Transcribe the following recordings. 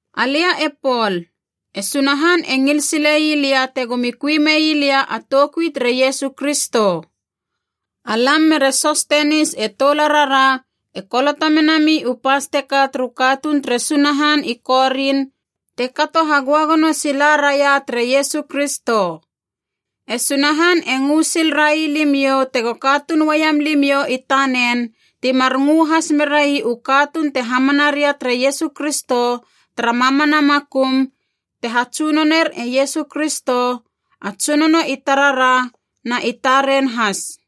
Alia e Pol, e Sunahan e ngil sile ii lia tegomi kui mei lia a toukui tere Iesu Kristo. Alam mere Sostenis e toularara e koloto menami u pas teka turu katuun tere Sunahan i Korin te kato hagöagono sila raia tere Iesu Kristo. E Sunahan e ngö sil rai limiou tego katuun uaiam limiou i tanen timar ngö has merai u katuun te hamana ria tere Iesu Kristo tara mamana makum, te hatsunoner e Iesu Kristo, a Tsunono i tarara na i taren has.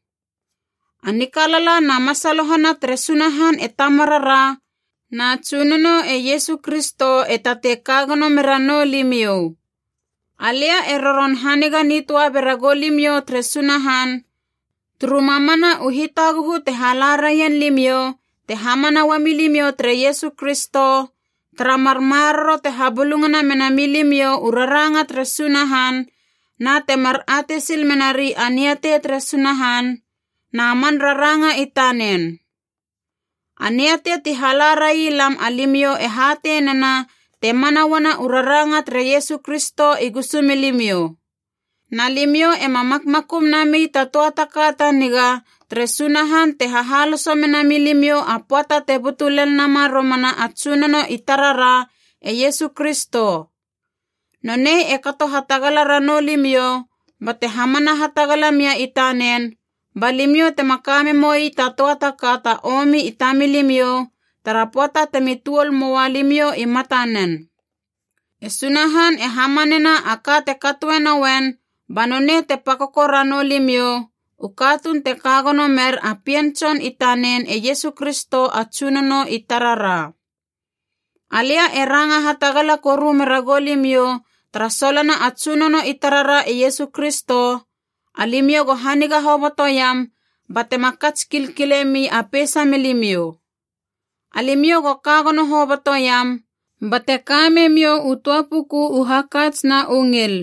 A nikalala na masalohana tere Sunahan e Tamarara, na Tsunono e Iesu Kristo e tatei kagono me ranou limiou. Alia e roron haniga nitöa bera goulimiou tere Sunahan, turu mamana u hitaguhu te hala raien limiou te hamana ua milimiou tere Iesu Kristo, tara mar maroro te habulungana mena milimiou u raranga tere Sunahan, na temar atei sil menari a niatei tere Sunahan na man raranga i tanen. A niatei ti hala rai lam alimiou e hatei nena te mana uana u raranga tere Iesu Kristo i gusu milimiou. Na limiou ema makmakum nami ta töa ta ka ta niga tere Sunahan te hahaloso mena milimiou a pöata te butu lel nama romana a Tsunono i tarara e Iesu Kristo. Nonei e kato hatagala ranou limiou, bate hamana hatagala mia i tanen ba limiou tema kame moi ta töa ta ka ta omi i tamilimiou tara pöata temi tuol moua limiou i mata nen. E Sunahan e hamanena a ka te katoe nouen ba nonei te pakoko ranou limiou, u katuun te kagono mer a pien Tson i tanen e Iesu Kristo a Tsunono i tarara. Alia e ranga hatagala koru meragou limiou tara solona a Tsunono i tarara e Iesu Kristo, alimiou go haniga hobotoiam batema kats kilkile mi a peisa milimiou. Alimiou go kagono hobotoiam, bate ka memiou u töa puku u hakats na u ngil.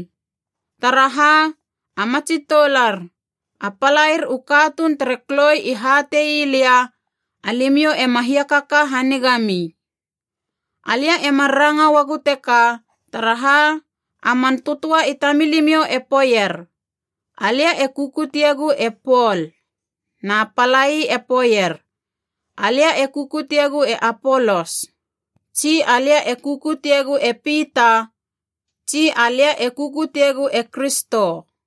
Taraha, a matsi toular, a palair u katuun tere Kloi i hate ii lia, alimiou ema hiakaka haniga mi. Alia e mar ranga uagu teka taraha, a man tötöa i tamilimiou e poeier, “Alia e kukutiegu e Pol,” na palai e poeier “Alia e kukutiegu e Apolos,” tsi “Alia e kukutiegu e Pita,” tsi “Alia e kukutiegu e Kristo.”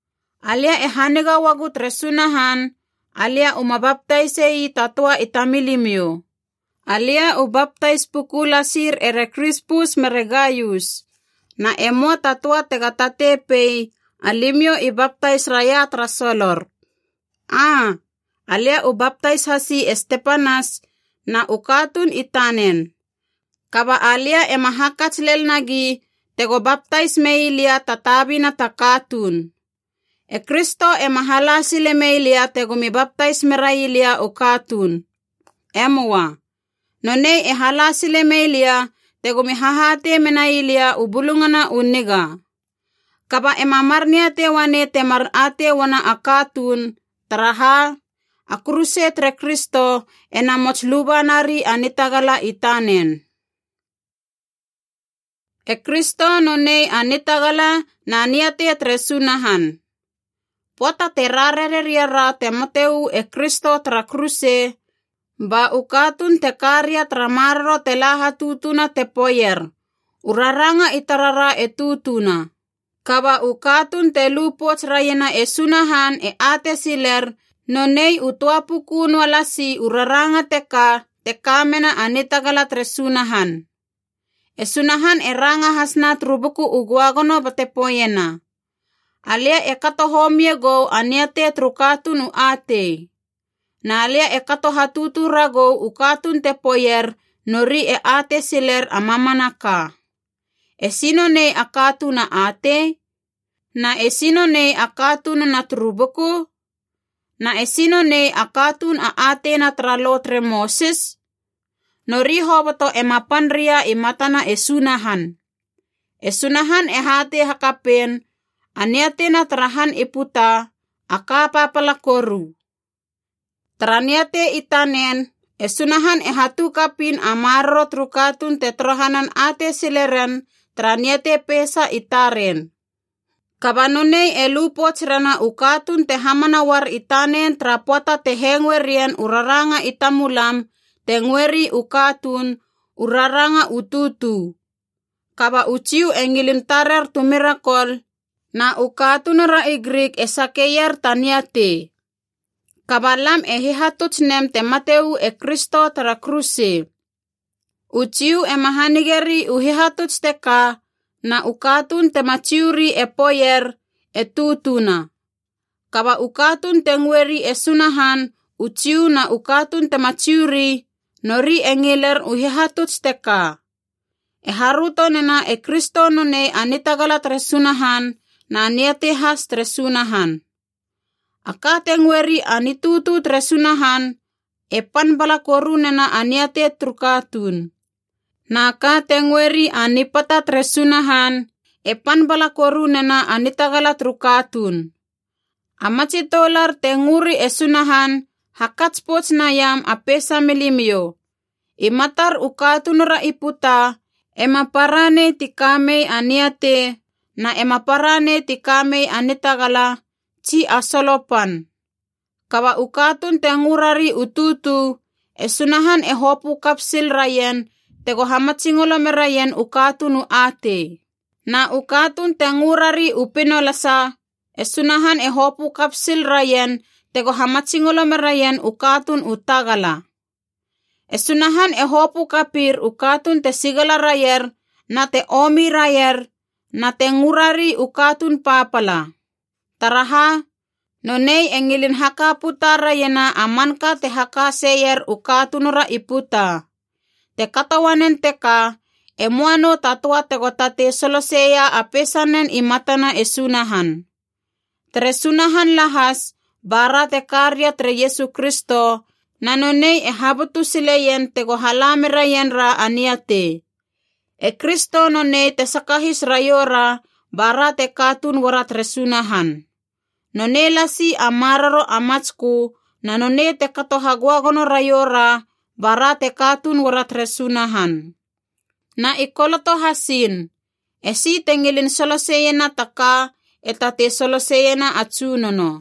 Alia e haniga uagu tere Sunahan alia uma baptaise ii ta töa i tamilimiou. Alia u baptais puku lasir ere Krispus mere Gaius. Na e möa ta töa tega tatei pei, alimiou i baptais raia tara solor. (Aa, alia u baptais hasi e Stepanas na u katuun i tanen. Kaba alia ema hakats lel nagi tego baptais mei lia ta tabina ta katuun.) E Kristo ema hala sile mei lia tegomi baptais merai lia u katuun. E möa. Nonei e hala sile mei lia tegomi hahatei menai lia u Bulungana u Niga. Kaba ema mar niatei uanei temar atei uana a katuun, taraha a kuruse tere Kristo e namots lubanari a nitagala i tanen. E Kristo nonei a nitagala na niatei tere Sunahan. Pöata te rarare ria ra te mate uu e Kristo tara kuruse, ba u katuun te ka ria tara maroro te la hatutuna te poeier u raranga i tarara e tutuna. Kaba u katuun te lu pouts raiena e Sunahan e atei siler nonei u töa puku noa lasi u raranga teka te ka mena a nitagala tere Sunahan. E Sunahan e ranga hasna turu Buku u Göagono bate poeiena: “Alia e kato homie gou a niatei turu katuun u atei. Na lia e kato hatutu ragou u katuun te poeier nori e atei siler a mamanaka.” Esi nonei a katuun a atei? Na esi nonei a katununa turu buku? Na esi nonei a katuun a ateina tara Lo tere Mosis? Nori hoboto ema pan ria i matana e Sunahan. E Sunahan e hatei hakapein a niateina tara han i puta, a ka papala koru. Tara niatei i tanen e Sunahan e hatu kapiin a maroro turu katuun te torohanan atei sile ren tara niatei peisa i taren. Kaba nonei e lu pouts rena u katuun te hamana uar i tanen tara pöata te hengoe rien u raranga i tamulam, te ngöeri u katuun, u raranga u tutu. Kaba u Jiu e ngilin tarer tu mirakol, na u katunura i Grik e sakeier ta niatei. Kaba lam e hihatuts nem te mate uu e Kristo tara kuruse. U Jiu ema hanigeri u hihatuts teka, na u katuun tema Jiu ri e poeier, e tutuna. Kaba u katuun te ngöri e Sunahan, u Jiu na u katuun tema Jiu ri, nori e ngiler u hihatuts teka. E haröto nena e Kristo nonei a nitagala tere Sunahan na niatei has tere Sunahan. A ka te ngöeri “a nitutu tere Sunahan” e pan bala koru nena a niatei turu katuun. Na ka te ngöeri “a nipata tere Sunahan” e pan bala koru nena a nitagala turu katuun. A matsi toular te ngöri e Sunahan, hakats pouts naiam a peisa milimiou. I matar u katunura i puta, ema para nei ti ka mei a niatei, na ema para nei ti ka mei a nitagala, tsi a solo pan. Kaba u katuun te ngö rari u tutu, e Sunahan e hopö kap sil raien tego hamatsingolo meraien u katuun u atei. Na u katuun te ngö rari u pinolasa, e Sunahan e hopö kap sil raien tego hamatsingolo meraien u katuun u tagala. E Sunahan e hopö kapir u katuun te sigala raier na te omi raier na te ngörari u katuun papala. Taraha, nonei e ngilin haka puta raiena a manka te haka seier u katunura i puta. Te kato uanen teka e möa nou ta töa tego tatei soloseia a peisanen i matana e Sunahan. Tere Sunahan lahas bara te ka ria tere Iesu Kristo, na nonei e habutu sileien tego hala meraien ra a niatei. E Kristo nonei te sakahis raioura bara te katuun uara tere Sunahan. Nonei lasi a maroro a matskö na nonei te kato hagöagono raioura bara te katuun uara tere Sunahan. Na i koloto hasiin, “Esi te ngilin soloseiena ta ka e tatei soloseiena a Tsunono.”